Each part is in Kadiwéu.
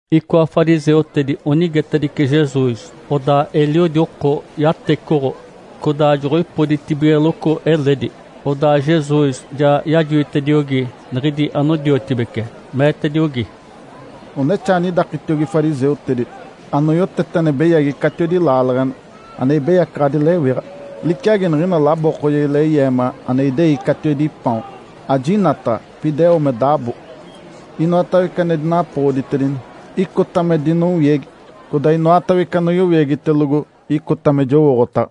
Icoa fariseutedi onigetedice Jesus, odaa eliodi oko yatecoɡ̶o codaa joɡ̶oipoditibigeloco eledi. Odaa Jesus ja yajoitediogi niɡ̶idi anodiotibece, meetediogi, “Onexaa anidakitiogi fariseutedi anoyotete ane beyagi catiwedi laaleɡ̶ena, ane ibeyacaɡ̶adi lewiɡ̶a. Liciagi niɡ̶ina labookojegi leyeema ane idei catiwedi paon, ajinataɡ̶a, pida eo me dabo. Inoatawece ane dinapoɡ̶oditedini, icota me dinowiegi, codaa inoatawece anoyowiegitelogo, icota me jowooɡ̶otaɡ̶a.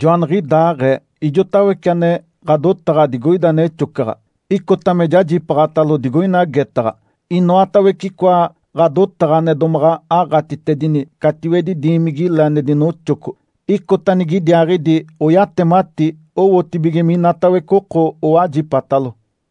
Joaniɡ̶idaaɡ̶ee ijoatawece ane ɡ̶adotaɡ̶a digoida nexocaɡ̶a, icota me jajipaaɡ̶atalo digoina getaɡ̶a. Inoatawece icoa ɡ̶adotaɡ̶a ane domaɡ̶a aɡ̶atitedini catiwedi diimigi-le ane dinoxoco, icota nigidiaaɡ̶idi oyatemati owotibige minatawece oko owajipatalo.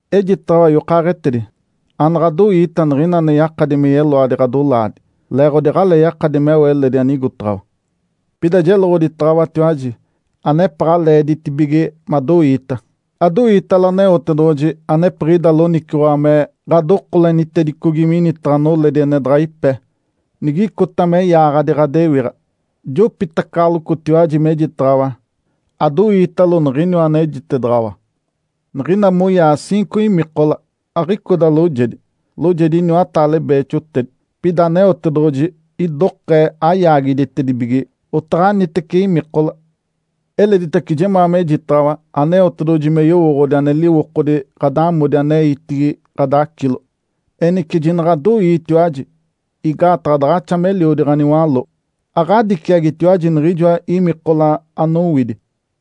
Ejitaɡ̶awa yokaaɡ̶etedi, anaɡ̶adoiita niɡ̶ina ane yakadi me yeloadi ɡ̶adolaadi, leeɡ̶odi aɡ̶alee yakadi meo eledi anigotaɡ̶awa. Pida jeloɡ̶oditaɡ̶awatiwaji anepaɡ̶a leeditibige madoiita. Adoiitalo Aneotedoɡ̶oji anepiɡ̶ida loniciwaɡ̶a me ɡ̶adokolenitedicogi minitaɡ̶a noledi ane daɡ̶a ipe, nigicota me yaaɡ̶adi ɡ̶adewiɡ̶a. Jopitacaɡ̶alocotiwaji mejitaɡ̶awa, adoiitalo niɡ̶iniwa anejitedaɡ̶awa. Niɡ̶ina moyaa ciinco imikola, aɡ̶icoda loojedi, loojedi iniwataale beexotedi. Pida Aneotedoɡ̶oji idokee ayaagiditedibige otaɡ̶anitece imikola. Eleditace jemaa mejitaɡ̶awa Aneotedoɡ̶oji me yowooɡ̶odi ane liwokodi ɡ̶adamodi aneitigi ɡ̶adacilo. Enice jinaɡ̶adoiitiwaji, igaataɡ̶a daɡ̶axa meliodi ɡ̶aniwaló, aɡ̶adiciagitiwaji niɡ̶ijoa imikola anowidi.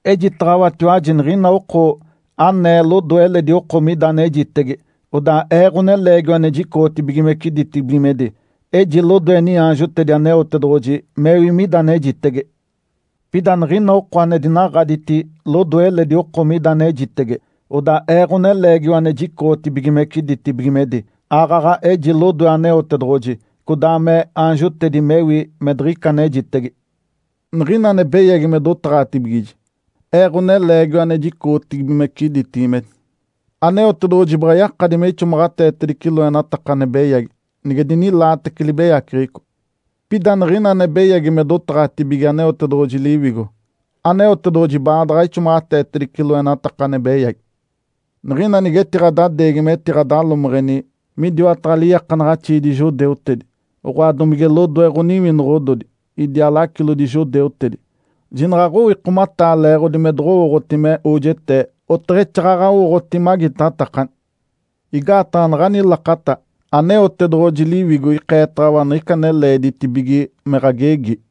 Ejitaɡ̶awatiwaji niɡ̶ina oko anee lodoe eledi oko mida anejitege, odaa Ee, Ǥoneleegiwa ane jicoɡ̶otibigimece ditibigimedi, eji lodoe niaanjotedi Aneotedoɡ̶oji mewi mida anejitege. Pida niɡ̶ina oko ane dinaɡ̶aditi lodoe eledi oko mida anejitege, odaa Ee, Ǥoneleegiwa ane jicoɡ̶otibigimece ditibigimedi, aaɡ̶aɡ̶a eji lodoe Aneotedoɡ̶oji codaa me aanjotedi mewi me diɡ̶ica anejitege. Niɡ̶ina ane beyagi me dotaɡ̶atibigiji, Ee, Ǥoneleegiwa ane jicoɡ̶otibigimece ditibigimedi, Aneotedoɡ̶oji baɡ̶a yakadi me ixomaɡ̶ateetedice loenataka ane beyagi, nige dinilaatece libeyaceɡ̶eco. Pida niɡ̶ina ane beyagi me dotaɡ̶atibige Aneotedoɡ̶oji Liwigo, Aneotedoɡ̶oji baadaɡ̶a ixomaɡ̶ateetedice loenataka ane beyagi. Niɡ̶ina nigetiɡ̶adadeegi metiɡ̶adalomeɡ̶eni midiwataɡ̶a liiakanaɡ̶axiidi judeutedi, oɡ̶oa, domige lodoe ɡ̶oniwinoɡ̶ododi idiaa lacilodi judeutedi, jinaɡ̶a aɡ̶owikomataa leeɡ̶odi me doɡ̶owooɡ̶oti me ojetee oteɡ̶exaaɡ̶aɡ̶a owooɡ̶oti magitatakani. Igaataɡ̶a naɡ̶ani lakata, Aneotedoɡ̶oji Liwigo ikeetaɡ̶awa niɡ̶ica ane leeditibige me ɡ̶agegi.”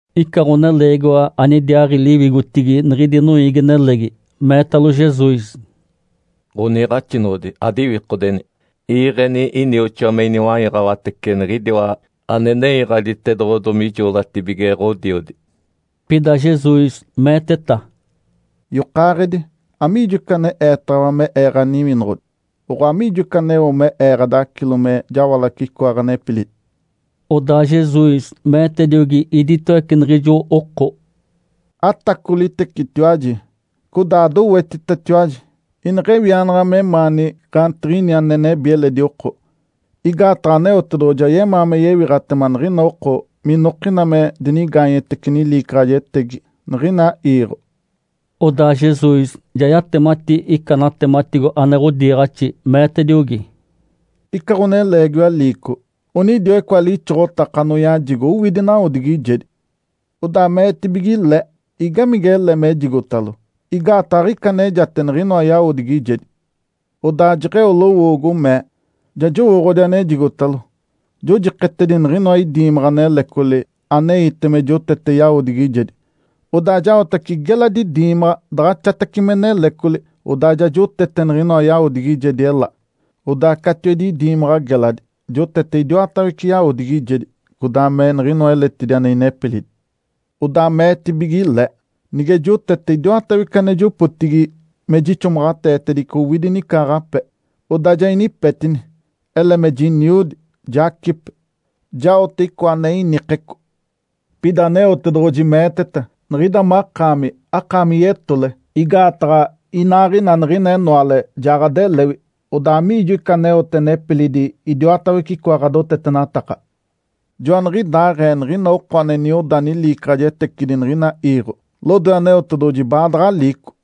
Ica ɡ̶oneleegiwa anidiaaɡ̶i liwigotigi niɡ̶idi noiigi-nelegi meetalo Jesus, “Ǥoniiɡ̶axinoɡ̶odi, adiwikodeni, iiɡ̶eni inioxoa me iniwaiɡ̶awatece niɡ̶idiwa ane nenyaɡ̶aditedoɡ̶odomi ijoolatibige ɡ̶odiodi.” Pida Jesus meeteta, “Yokaaɡ̶edi, amiijo ica aneetaɡ̶awa me Ee ɡ̶aniwinoɡ̶odi, oɡ̶oa amiijo ica aneo me Ee ɡ̶adacilo me jawalace icoa ɡ̶anepilidi?” Odaa Jesus meetediogi iditawece niɡ̶ijo oko, “Atacolitecetiwaji, codaa adowetitatiwaji ineɡ̶ewianaɡ̶a memaani gaantiɡ̶ini ane nebi eledi oko. Igaataɡ̶a Aneotedoɡ̶oji ayemaa me yewiɡ̶atema niɡ̶ina oko minokina me dinigaanyetece niliicaɡ̶ajetegi niɡ̶ina iiɡ̶o.” Odaa Jesus ja yatemati ica natematigo ane ɡ̶odiiɡ̶axi, meetediogi, “Ica ɡ̶oneleegiwa liico, onidiwa icoa lixoɡ̶otaka anoyajigo owidi nawodigijedi. Odaa meetibige le, ‘Igamige ele mejigotalo? Igaataɡ̶a aɡ̶ica anejate niɡ̶inoa yawodigijedi.’ Odaa jeɡ̶eo lowoogo, mee, ‘Ja jowooɡ̶odi anejigotalo, jojiketedi niɡ̶inoa idiimaɡ̶a nelecoli aneite me jotete yawodigijedi, odaa jaotace geladi diimaɡ̶a daɡ̶axatace me nelecoli, odaa ja jotete niɡ̶inoa yawodigijedi ela. Odaa catiwedi idiimaɡ̶a geladi jotete idiwatawece yawodigijedi codaa me niɡ̶inoa eletidi ane inepilidi.’ Odaa meetibige le, ‘Nige jotete idiwatawece ane jopotigi me jixomaɡ̶ateetedice owidi nicaaɡ̶ape. Odaa ja inipetini, ele me jiniodi, jacipe, jaote icoa ane inikeco.’ Pida Aneotedoɡ̶oji meeteta, ‘Niɡ̶ida makaami, akaami yetole! Igaataɡ̶a inaaɡ̶ina niɡ̶ina enoale ja ɡ̶adelewi. Odaa amiijo ica aneote nepilidi idiwatawece icoa ɡ̶adotetenataka?’ Joaniɡ̶idaaɡ̶ee niɡ̶ina oko ane nioda niliicaɡ̶ajetecidi niɡ̶ina iiɡ̶o, lodoe Aneotedoɡ̶oji baadaɡ̶a liico.”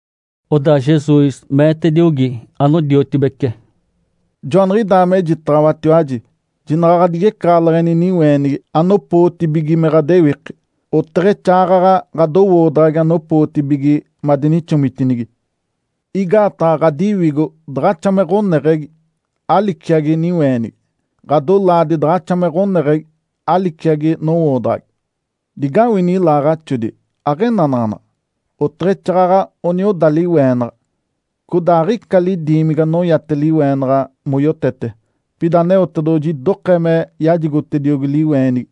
Odaa Jesus meetediogi anodiotibece, “Joaniɡ̶idaa mejitaɡ̶awatiwaji jinaɡ̶a ɡ̶adigecaɡ̶aleɡ̶eni niweenigi anopootibige me ɡ̶adewiki, oteɡ̶exaaɡ̶aɡ̶a ɡ̶adowoodaɡ̶agi anopootibige madinixomitinigi. Igaataɡ̶a ɡ̶adiwigo daɡ̶axa me ɡ̶oneɡ̶egi aliciagi niweenigi. Ǥadolaadi daɡ̶axa me ɡ̶oneɡ̶egi aliciagi nowoodaɡ̶agi. Digawini ilaaɡ̶axodi! Aɡ̶enanaɡ̶anaɡ̶a, oteɡ̶exaaɡ̶aɡ̶a onioda liweenaɡ̶a. Codaa aɡ̶ica lidiimigi anoyate liweenaɡ̶a moyotete. Pida Aneotedoɡ̶oji idokee me yajigotediogi liweenigi.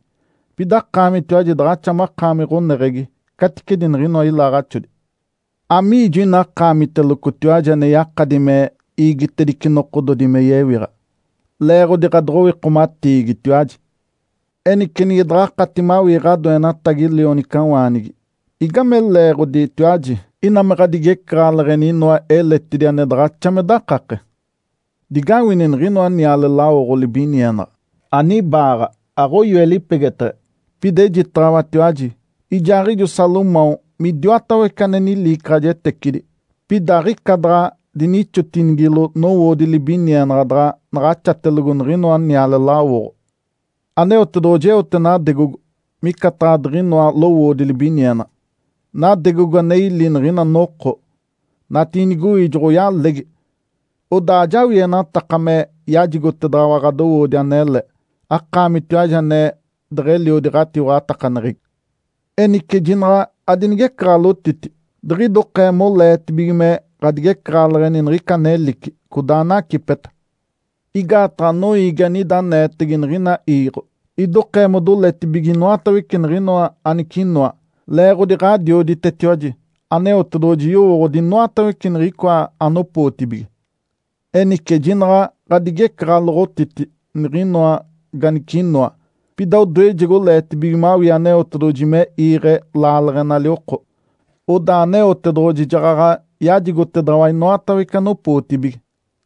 Pida akaamitiwaji daɡ̶axa makaami ɡ̶oneɡ̶egi caticedi niɡ̶inoa ilaaɡ̶axodi. Amiijo ina akaamitelocotiwaji ane yakadi me iigitedice nokododi me yewiɡ̶a, leeɡ̶odi ɡ̶adoɡ̶owikomatiigitiwaji? Enice nige daɡ̶akati mawii ɡ̶adoenatagi lionicawaanigi, igame leeɡ̶oditiwaji ina me ɡ̶adigecaɡ̶aleɡ̶eni inoa eletidi ane daɡ̶axa me dakake? Digawini niɡ̶inoa niale lawoɡ̶o libinienaɡ̶a! Anibaaɡ̶a, aɡ̶oyoe lipegeteɡ̶e. Pida ejitaɡ̶awatiwaji ijaaɡ̶ijo Salomão midiwatawece ane niliicaɡ̶ajetecidi, pida aɡ̶ica daɡ̶a dinixotinigilo nowoodi libinienaɡ̶a daɡ̶a naɡ̶axatelogo niɡ̶inoa niale lawoɡ̶o. Aneotedoɡ̶oji eote nadegogo micataɡ̶a diɡ̶inoa lowoodi libinienaɡ̶a. Nadegogo ane ili niɡ̶ina noko, natiinigoi joɡ̶oyalegi. Odaa ajawienataka me yajigotedaɡ̶awa ɡ̶adowoodi anele, akaamitiwaji ane deɡ̶eliodi ɡ̶atiwaɡ̶atakaneɡ̶egi. Enice jinaɡ̶a adinigecaɡ̶aloɡ̶otiti, diɡ̶idokee moleetibige me ɡ̶adigecaɡ̶aleɡ̶eni niɡ̶ica anelici, codaa anacipeta. Igaataɡ̶a noiigi anida aneetege niɡ̶ina iiɡ̶o idokee modoletibige inoatawece niɡ̶inoa anicinoa. Leeɡ̶odi Ǥadioditetiwaji Aneotedoɡ̶oji yowooɡ̶odi inoatawece niɡ̶icoa anopootibige. Enice jinaɡ̶a ɡ̶adigecaɡ̶aloɡ̶otiti niɡ̶inoa ganicinoa, pida odoejegi oleetibige mawii Aneotedoɡ̶oji me iiɡ̶e laaleɡ̶enali oko, odaa Aneotedoɡ̶oji jaɡ̶aɡ̶a yajigotedaɡ̶awa inoatawece anopootibige.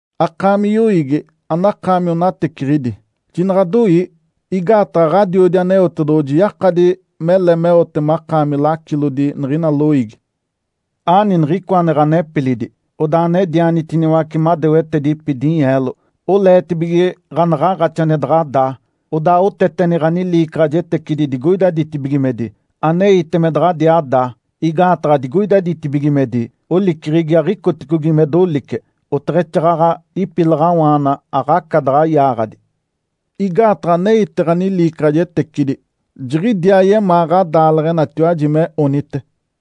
Akaami yoiigi anakaami onateciɡ̶idi, jinaɡ̶adoii. Igaataɡ̶a Ǥadiodi Aneotedoɡ̶oji yakadi mele meote makaami lacilodi niɡ̶ina loiigi. Aani niɡ̶icoa ane ɡ̶anepilidi, odaa anedianitiniwace madewetedipi dinyeelo. Oleetibige ɡ̶anaɡ̶aaɡ̶axi ane daɡ̶a daa, odaa oteteni ɡ̶aniliicaɡ̶ajetecidi digoida ditibigimedi, aneite me daɡ̶adiaa daa. Igaataɡ̶a digoida ditibigimedi oliceɡ̶egi aɡ̶icoticogi me dolice, oteɡ̶exaaɡ̶aɡ̶a ipilaɡ̶awaana aɡ̶aca daɡ̶a yaaɡ̶adi. Igaataɡ̶a aneite ɡ̶aniliicaɡ̶ajetecidi, jiɡ̶idiaa yemaa ɡ̶adaaleɡ̶enalitiwaji me onite.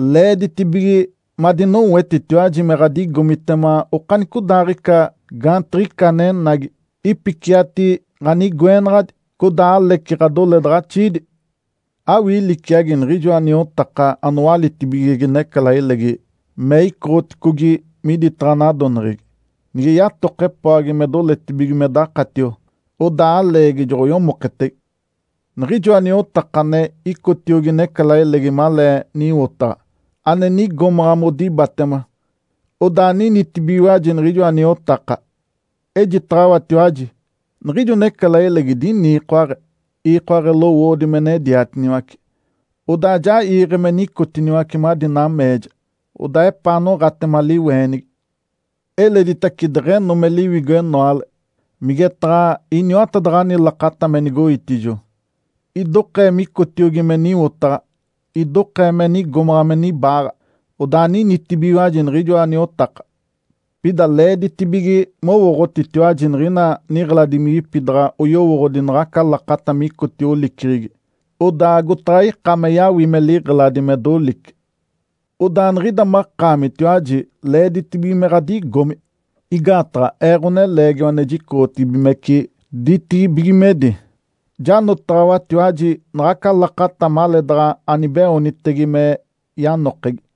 Leeditibige madinoetitiwaji me ɡ̶adigomitema okanicodaaɡ̶ica gaantiɡ̶ica anenagi, ipiciati ɡ̶anigoenaɡ̶adi, codaa aleci ɡ̶adoledaɡ̶axiidi. Awii liciagi niɡ̶ijoa niotaka anowalitibigege necalailegi me icoɡ̶oticogi miditaɡ̶a nadoneɡ̶egi. Nige yatoke epoagi me doletibige me dakatio, odaa aleegi joɡ̶oyomoketege. Niɡ̶ijoa niotaka ane icotiogi necalailegi malee niwotaɡ̶a, ane nigomaɡ̶a modibatema, odaa ninitibigiwaji niɡ̶ijoa niotaka. Ejitaɡ̶awatiwaji, niɡ̶ijo necalailegi diniikoaɡ̶e, iikoaɡ̶e lowoodi me nediatiniwace, odaa ja iiɡ̶e me nicotiniwace madi nameeja, odaa epaa noɡ̶atema liweenigi. Eleditace deɡ̶eno me liwigo enoale, migetaɡ̶a iniwatadaɡ̶ani lakata me nigoitijo, idokee micotiogi me niwotaɡ̶a, idokee me nigomaɡ̶a me nibaaɡ̶a, odaa ninitibigiwaji niɡ̶ijoa niotaka. Pida leeditibige mowooɡ̶otitiwaji niɡ̶ina niɡ̶eladimigi daɡ̶a yowooɡ̶odi naɡ̶aca lakata micotio oliceɡ̶egi, odaa agotaɡ̶a ika me yawime liɡ̶eladi me dolice. Odaa niɡ̶ida makaamitiwaji leeditibige me ɡ̶adigomi, igaataɡ̶a Ee, Ǥoneleegiwa ane jicoɡ̶otibigimece ditibigimedi, janotaɡ̶awatiwaji naɡ̶aca lakata maleedaɡ̶a anibeoonitege me yanokegi.”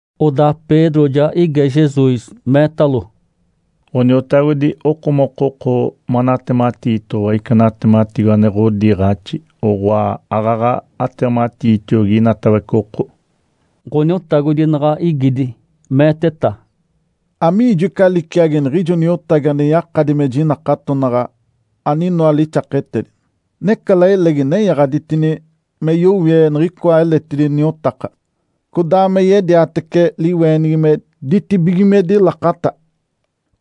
Odaa Pedro ja ige Jesus, meetalo, “Ǥoniotagodi, okomokoko manatematiitoɡ̶owa ica natematigo ane ɡ̶odiiɡ̶axi, oɡ̶oa, aaɡ̶aɡ̶a atematiitiogi inatawece oko?” Ǥoniotagodi naɡ̶a igidi, meeteta, “Amiijo ica liciagi niɡ̶ijo niotagi ane yakadi me jinakatonaɡ̶a, aninoa lixaketedi? Necalailegi nenyaɡ̶aditini me yowie niɡ̶icoa eletidi niotaka, codaa me yediatece liweenigi me ditibigimedi lakata.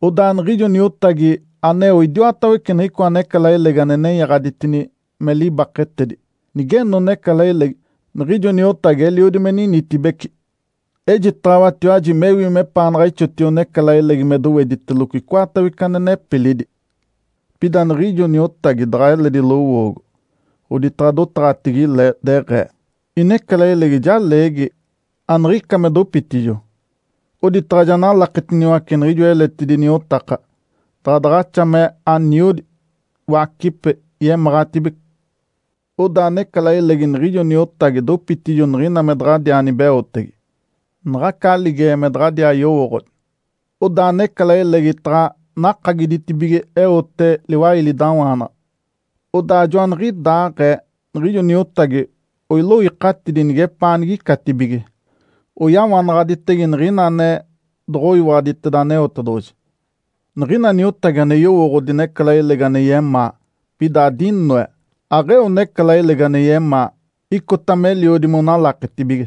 Odaa niɡ̶ijo niotagi aneo idiwatawece niɡ̶icoa necalailegi ane nenyaɡ̶aditini me libaketedi, nigeno necalailegi, niɡ̶ijo niotagi eliodi me ninitibece. Ejitaɡ̶awatiwaji mewi mepaanaɡ̶a ixotio necalailegi me doweditelogo icoatawece ane nepilidi. Pida niɡ̶ijo niotagi daɡ̶a eledi lowoogo, oditaɡ̶a dotaɡ̶atigi le, deɡ̶ee, ‘Inecalailegi ja leegi aniɡ̶ica me dopitijo’, oditaɡ̶a ja nalaketiniwace niɡ̶ijoa eletidi niotaka, daɡ̶a daɡ̶axa me aniodi, wacipe, yemaɡ̶atibece. Odaa necalailegi niɡ̶ijo niotagi dopitijo niɡ̶ina me daɡ̶adiaa nibeotege, naɡ̶aca aligeɡ̶e me daɡ̶adiaa yowooɡ̶odi. Odaa necalailegi taɡ̶a nakagiditibige eote liwailidawaanaɡ̶a. Odaa joaniɡ̶idaaɡ̶ee niɡ̶ijo niotagi oiloikatidi nigepaa anigicatibige, oyawanaɡ̶aditege niɡ̶ina ane doɡ̶oyiwaɡ̶aditeda Aneotedoɡ̶oji. Niɡ̶ina niotagi ane yowooɡ̶odi necalailegi ane yemaa, pida adinoe, aɡ̶eo necalailegi ane yemaa, icota meliodi monalaketibige.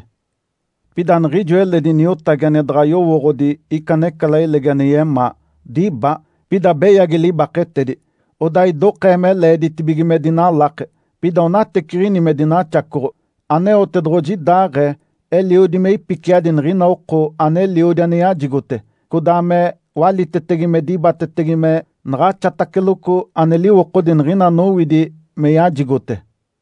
Pida niɡ̶ijo eledi niotagi ane daɡ̶a yowooɡ̶odi ica necalailegi ane yemaa, diba, pida beyagi libaketedi, odaa idokee me leeditibige me dinalake, pida onateciɡ̶ini me dinaxacoɡ̶o. Aneotedoɡ̶oji idaaɡ̶ee, eliodi me ipiciadi niɡ̶ina oko aneliodi ane yajigote. Codaa me walitetege me dibatetege me naɡ̶axataceloco ane liwokodi niɡ̶ina anowidi me yajigote.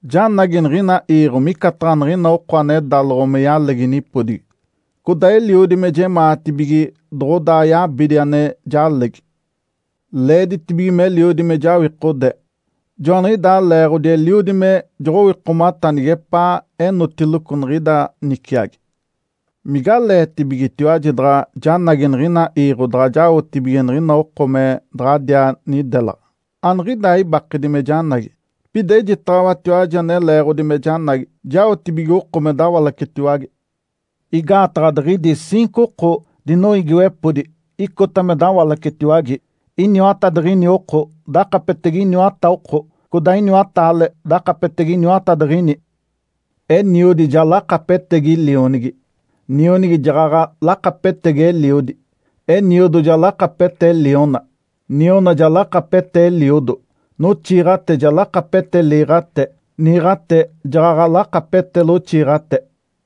Janagi niɡ̶ina iiɡ̶o micataɡ̶a niɡ̶ina oko ane dáloɡ̶o me yalegi nipodigi, codaa eliodi me jemaatibige doɡ̶odaa yabidi ane jalegi. Leeditibige meliodi me jawikode. Joaniɡ̶idaa leeɡ̶odi eliodi me joɡ̶owikomata nigepaa enotiloco niɡ̶ida niciagi. Migaleetibigetiwaji daɡ̶a janagi niɡ̶ina iiɡ̶o daɡ̶a jaotibige niɡ̶ina oko me daɡ̶adiaa nidelaɡ̶a? Aniɡ̶idaa ibakedi me janagi. Pida ejitaɡ̶awatiwaji ane leeɡ̶odi me janagi, jaotibige oko me dawalacetiwage. Igaataɡ̶a diɡ̶idi ciinco oko dinoiigiwepodi icota me dawalacetiwage, iniwatadiɡ̶ini oko dakapetege iniwata oko, codaa iniwataale dakapetege iniwatadiɡ̶ini. Eniodi ja lakapetegi lionigi, nionigi jaɡ̶aɡ̶a lakapetegi eliodi; eniodo ja lakapete liona, niona ja lakapete eliodo; noxiiɡ̶ate ja lakapete liiɡ̶ate, niiɡ̶ate jaɡ̶aɡ̶a lakapete loxiiɡ̶ate.”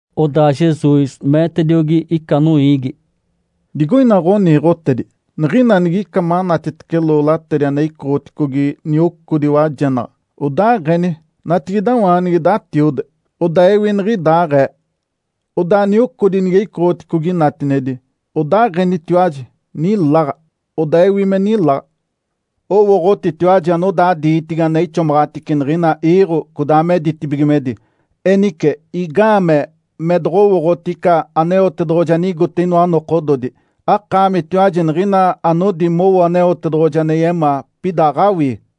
Odaa Jesus meetediogi ica noiigi, “Digoina ɡ̶oniiɡ̶otedi, niɡ̶ina nige ica manatitece lolaadi ane icoɡ̶oticogi niocodi wajenaɡ̶a, odaaɡ̶eni, ‘Natigidawaanigi datiode!’ Odaa ewi niɡ̶idaaɡ̶ee. Odaa niocodi nige icoɡ̶oticogi natinedi, odaaɡ̶enitiwaji, ‘Niláɡ̶a!’ Odaa ewi me niláɡ̶a. Owooɡ̶otitiwaji anodaa diitigi ane ixomaɡ̶atice niɡ̶ina iiɡ̶o, codaa me ditibigimedi. Enice, igaamee me doɡ̶owooɡ̶oti ica Aneotedoɡ̶oji anigote inoa nokododi? Akaamitiwaji niɡ̶ina anodi mowo Aneotedoɡ̶oji ane yemaa, pida aɡ̶awii.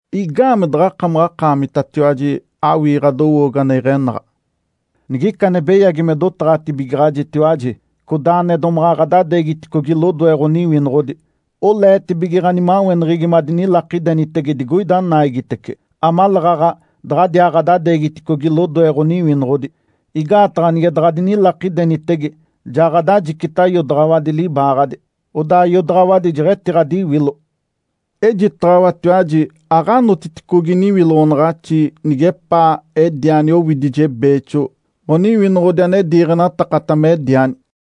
Igaamee daɡ̶akamaɡ̶akaamitatiwaji awii ɡ̶adowoogo ane iɡ̶enaɡ̶a? Nigica ane beyagi me dotaɡ̶atibigaɡ̶ajitiwaji, codaa ane domaɡ̶a ɡ̶adadeegiticogi lodoe ɡ̶oniwinoɡ̶odi, oleetibige ɡ̶animaweneɡ̶egi madinilakidenitege digoida naigitece, amaleeɡ̶aɡ̶a daɡ̶adiaa ɡ̶adadeegiticogi lodoe ɡ̶oniwinoɡ̶odi. Igaataɡ̶a nige daɡ̶adinilakidenitege, ja ɡ̶adajicita iodaɡ̶awadi libaaɡ̶adi, odaa iodaɡ̶awadi jeɡ̶etiɡ̶adiwilo. Ejitaɡ̶awatiwaji aɡ̶anotiticogi niwiloɡ̶onaɡ̶axi nigepaa ediani owidije beexo ɡ̶oniwinoɡ̶odi ane diiɡ̶enatakata mediani.”